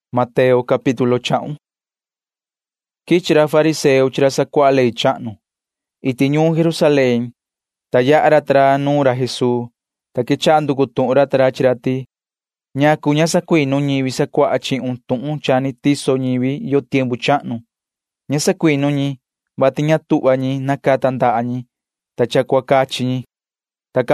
Quivi can quichi ra fariseo chi ra sacuaha ley chahnu. Iti ñuun Jerusalén quichi ra ta ra, ta yaha ra ta ra nuun ra Jesuu, ta quechaha nducu tuhun ra ta ra chi ra ti: ―¿Ñacu ña sacuinu ñivi sacuaha chihun tuhun cha ni tiso ñivi yo tiempu chahnu? Ña sacuinu ñi, vati ña tuhva ñi nacata ñi ndaha ñi, ta cha cua cachi ñi ―cati ra ta ra.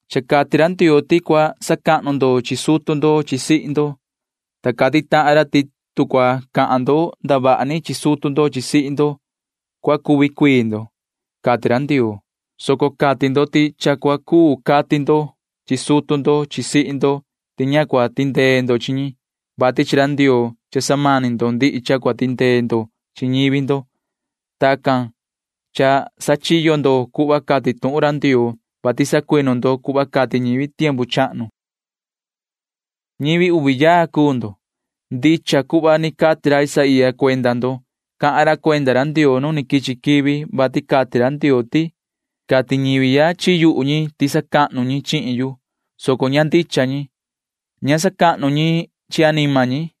Cha cati ra Ndioo ti cua sacahnu ndo chi sutu ndo chi sihi ndo, ta cati tahan ra ti tu cua cahan ndo ndavaha ni chi sutu ndo chi sihi ndo, na cua cuvi cuii ndo, cati ra Ndioo, soco cati maan ndo ti cha cua cuu cati ndo chi sutu ndo chi sihi ndo ti ña cua tindee ndo chi ñi, vati chi ra Ndioo cha samani ndo ndihi cha cua tindee ndo chi ñivi ndo. Tacan cha sachiyo ndo cuhva cati tuhun ra Ndioo, vati sacuinu ndo cuhva cati ñivi tiempu chahnu. Ñivi uvi yaa cuu ndo. Ndicha cuhva ni cati ra Isaía cuenda ndo. Cahan ra cuenda ra Ndioo [nu ni quichi quivi], vati cati ra Ndioo ti: Cati ñivi ya chi yuhu ñi ti sacahnu ñi chihin yu, soco ña ndicha cuhva cahan ñi. Ña sacahnu ñi chi anima ñi.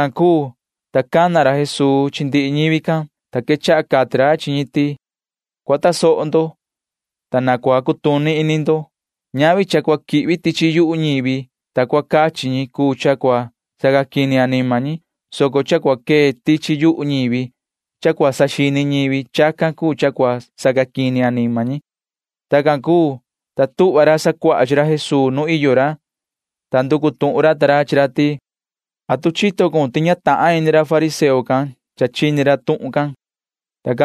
Tacan cuu, ta cana ra Jesuu chi ndihi ñivi can, ta quechaha cati ra chi ñi ti: ―Cua tasoho ndo, ta na cua cutuni ini ndo. Ñavi cha cua quihvi tichi yuhu ñivi, ta cua cachi ñi cuu cha cua sacaquini anima ñi, soco cha cua quee tichi yuhu ñivi, cha cua saxini ñivi―chacan cuu cha cua sacaquini anima ñi ―cati ra. Tacan cuu, ta tuhva ra sacuaha chi ra Jesuu nu iyo ra, ta nducu tuhun ra ta ra chi ra ti: ―¿Atu chito cun ti ña chaa ini ra fariseo can, ta chini ra tuhun can? ―cati ra ta ra.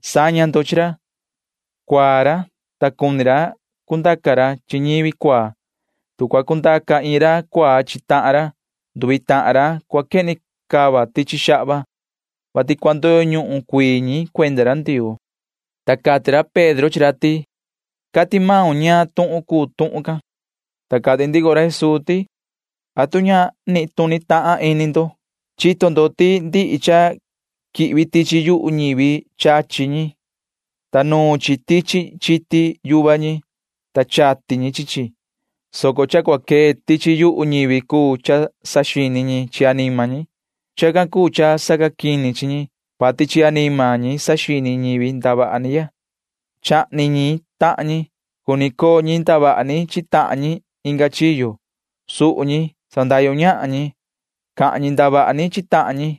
Saña ndo chi ra. Cuaa ra, ta cuni ra cundaca ra chi ñivi cuaa. Tu cua cundaca iin ra cuaa chi tahan ra, nduvi tahan ra cua quehni cava tichi xahva. Tacan cati ra, [vati cua ndoyo ñuhun cuii ñi cuenda ra Ndioo]. Ta cati ra Pedro chi ra ti: ―Cati maun ñaan tuhun cuu tuhun can. Ta cati ndico ra Jesuu ti: ―¿Atu ña nituni tahan ini ndo? Chito ndo ti ndihi cha quihvi tichi yuhu ñivi chachi ñi, ta nuun chi tichi chiti yuva ñi, ta chati ñi chi chi, soco cha cua quee tichi yuhu ñivi cuu cha saxini ñi chi anima ñi. Chacan cuu cha sacaquini chi ñi, vati chi anima ñi saxini ñivi ndavaha ni ya. Chahni ñi tahan ñi. Cuni coo ñi ndavaha ni chi tahan ñi inga chiyo. Suhu ñi. Sandahyu ñahan ñi. Cahan ñi ndavaha ni chi tahan ñi.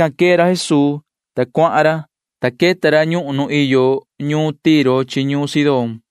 Tican quee ra Jesuu, ta cuahan ra, ta queta ra ñuhun nu iyo ñuun Tiro chi ñuun Sidón.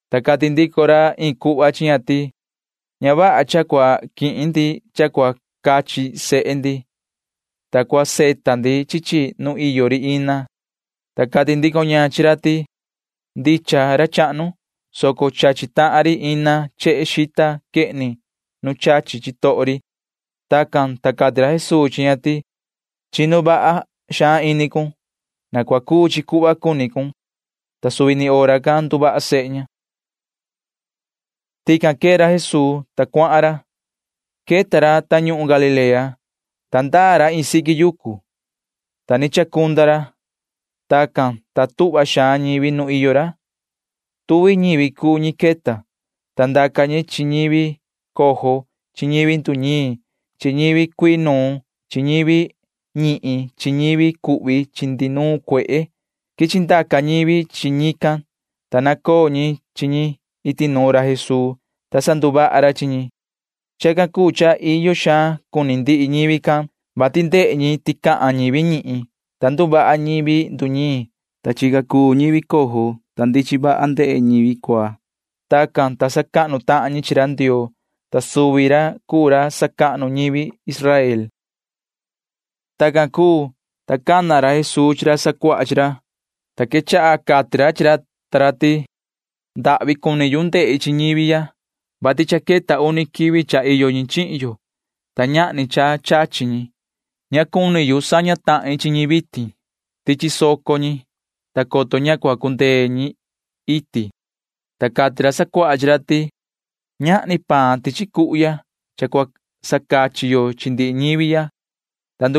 Ta cati ndico ra iin cuhva chi ña ti: ―Ña vaha cha cua quihin ndi cha cua cachi sehe ndi, ta cua savita ndi chi chi nu iyo ri ina ―cati ra. Ta cati ndico ña chi ra ti: ―Ndicha, ra chahnu, soco chachi tahan ri ina chehe xita quehni nu chachi chitoho ri ―cati ña. Tacan, ta cati ra Jesuu chi ña ti: ―Chinu vaha xaan ini cun, sihi. Na cua cuu chi cuhva cuni cun ―cati ra. Ta suvi ni hora can nduvaha sehe ña. Tican quee ra Jesuu, ta cuahan ra. Queta ra tañuhun Galilea, ta ndaa ra iin siqui yucu, ta ni chacunda ra. Tacan, ta tuhva xaan ñivi nu iyo ra. Tuvi ñivi cuu ñi queta, ta ndaca ñi chi ñivi cojo chi ñivi nduñiin chi ñivi cuii nuun chi ñivi ñihin chi ñivi cuhvi chi ndihi nuun cuehe. Quichi ndaca ñivi chi ñican, ta nacoo ñi chi ñi iti nuun ra Jesuu, ta sanduvaha ra chi ñi. Chacan cuu cha iyo xaan cuni ndihi ñivi can, vati ndehe ñi ti cahan ñivi ñihin, ta nduvaha ñivi nduñiin, ta chica cuu ñivi cojo, ta ndichin vaha ndehe ñivi cuaa. Tacan, ta sacahnu tahan ñi chi ra Ndioo, ta suvi ra cuu ra sacahnu ñivi Israel. Tacan cuu, ta cana ra Jesuu chi ra sacuaha chi ra, ta quechaha cati ra chi ra ta ra ti: ―Ndahvi cuni yu ndehi chi ñivi ya, vati cha queta uni quivi cha iyo ñi chihin yo, ta ñahni cha chachi ñi. Ña cuni yu saña tahin chi ñi vitin, ta chisoco ñi, coto ña cua cundee ñi iti ―cati ra. Ta cati ra sacuaha chi ra ti: ―Ñahni paan ihya tichi cuhu ya, ta cua sacachi yo chi ndihi ñivi ya ―cati ra ta ra.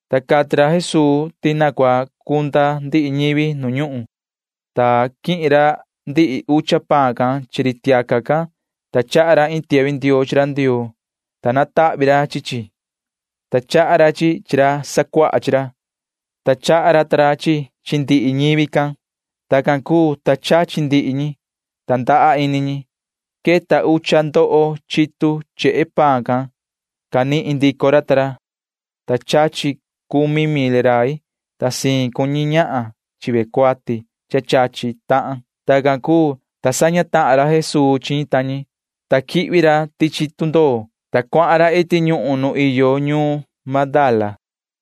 Ta cati ra Jesuu ti cua cunda ndihi ñivi nu ñuhun, ta quihin ra ndihi ucha tahan paan can chi ri tiaca can, ta chaha ra iin tiahvi ndioo chi ra Ndioo, ta natahvi ra chi chi, ta chaha ra chi chi chi ra sacuaha chi ra, ta chaha ra ta ra chi chi chi ndihi ñivi can. Tacan cuu, ta chachi ndihi ñi, ta ndaha ini ñi. Queta ucha ndoho chitu chehe paan can canihin ra ta ra, ta chachi cumi mil rai, ta siin cuu ñi ñahan chi ve cuati chachi tahan. Tacan cuu, ta saña tahan ra Jesuu chi ñi ta ñi, ta quihvi ra tichi tundoo, ta cuahan ra iti ñuhun nu iyo ñuun Magdala.